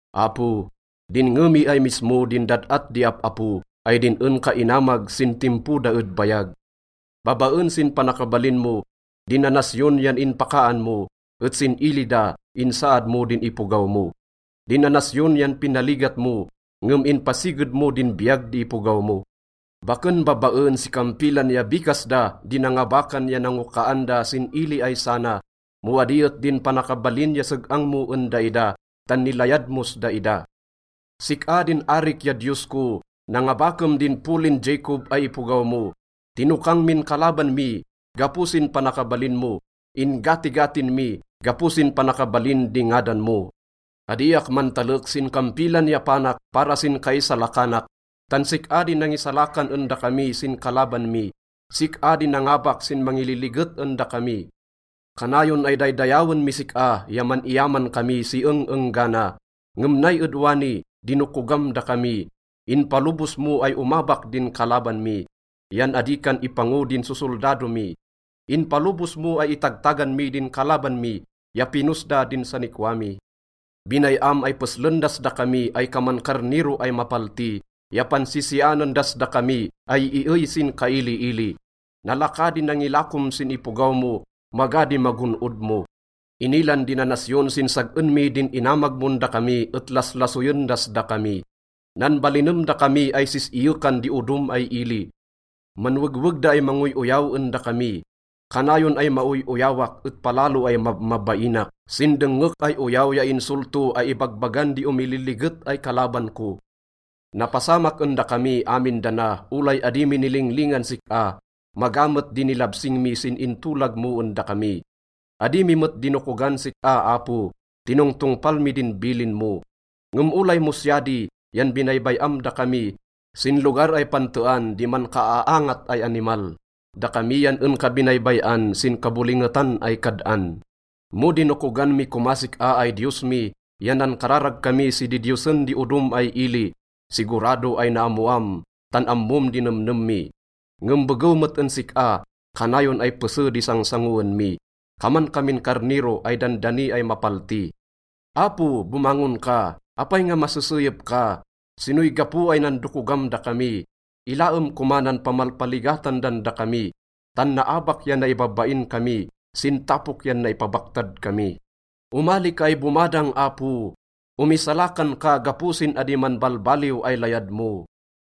Apo, dinnge mi ay mismo din dad-at di ap-apo, ay din en ka inamag sin timpo da ed bayag. Babaen sin panakabalin mo, din nanasyon yan inpakaan mo, et sin ili da, insaad mo din ipogaw mo. Din nanasyon yan pinaligat mo, ngem inpasiged mo din biyag di ipogaw mo. Baken babaen si kampilan ya bikas da di nangabakan ya nangokaan da sin ili ay sana, mo adi et din panakabalin ya seg-ang mo en daida, tan nilayad mos daida. Sik-a din arik ya Diyos ko, nangabakem din polin Jacob ay ipogaw mo. Tinokang min kalaban mi gapo sin panakabalin mo, in-gatigatin mi gapo sin panakabalin di ngadan mo. Adiak mantalek sin kampilan ya panak para sin kaisalakanak, tan sik-a di nangisalakan en dakami sin kalaban mi, sik-a di nangabak sin mangililiget en dakami. Kanayon ay daydayawen mis sik-a ya man-iyaman kami si eng-enggana. Ngem nay ed wani, dinokogam dakami, inpalobos mo ay omabak din kalaban mi, yan adi kan ipango din sosoldado mi. Inpalobos mo ay itagtagan mi din kalaban mi, ya pinos da din sanikwa mi. Binay-am ay peslen das dakami ay kaman karnero ay mapalti ya pansisianen das dakami ay iey sin kailiili. Nalaka di nangilakom sin ipogaw mo, maga di magon-od mo. Inilan di nanasyon sin sag-en mi din inamag mon dakami et laslasoyen das dakami. Nanbalinem dakami ay sis-iyekan di odom ay ili, manwegweg da ay mangoy-oyaw en dakami. Kanayon ay maoy-oyawak et palalo ay mabmabainak sin dengngek ay oyaw ya insolto ay ibagbagan di omililiget ay kalaban ko. Napasamak en dakami amin dana olay adi mi nilinglingan sik-a. Maga met di nilabsing mi sin intolag mo en dakami. Adi mi met dinokogan sik-a, Apo, tinongtongpal mi din bilin mo. Ngem olay mo siya di, yan binaybay-am dakami sin lugar ay pantean di mankaaangat ay animal. Dakami yan en ka binaybay-an sin kabolingetan ay kad-an. Mo dinokogan mi komas sik-a ay Diyos mi ya nankararag kami si didiyosen di odom ay ili, sigurado ay naammoam tan ammom di nemnem mi. Ngem begew met en sik-a, kanayon ay pese di sangsangoen mi, kaman kamin karnero ay dandani ay mapalti. Apo, bomangon ka! Apay nga maseseyep ka? Sinoy gapo ay nandokogam dakami? Ilaem koma nan pamalpaligatan dan dakami. Tan naabak ya naibabain kami, sin tapok yan naipabaktad kami. Omali ka ay bomadang, Apo, Omisalakan ka gapo sin adi manbalbaliw ay layad mo.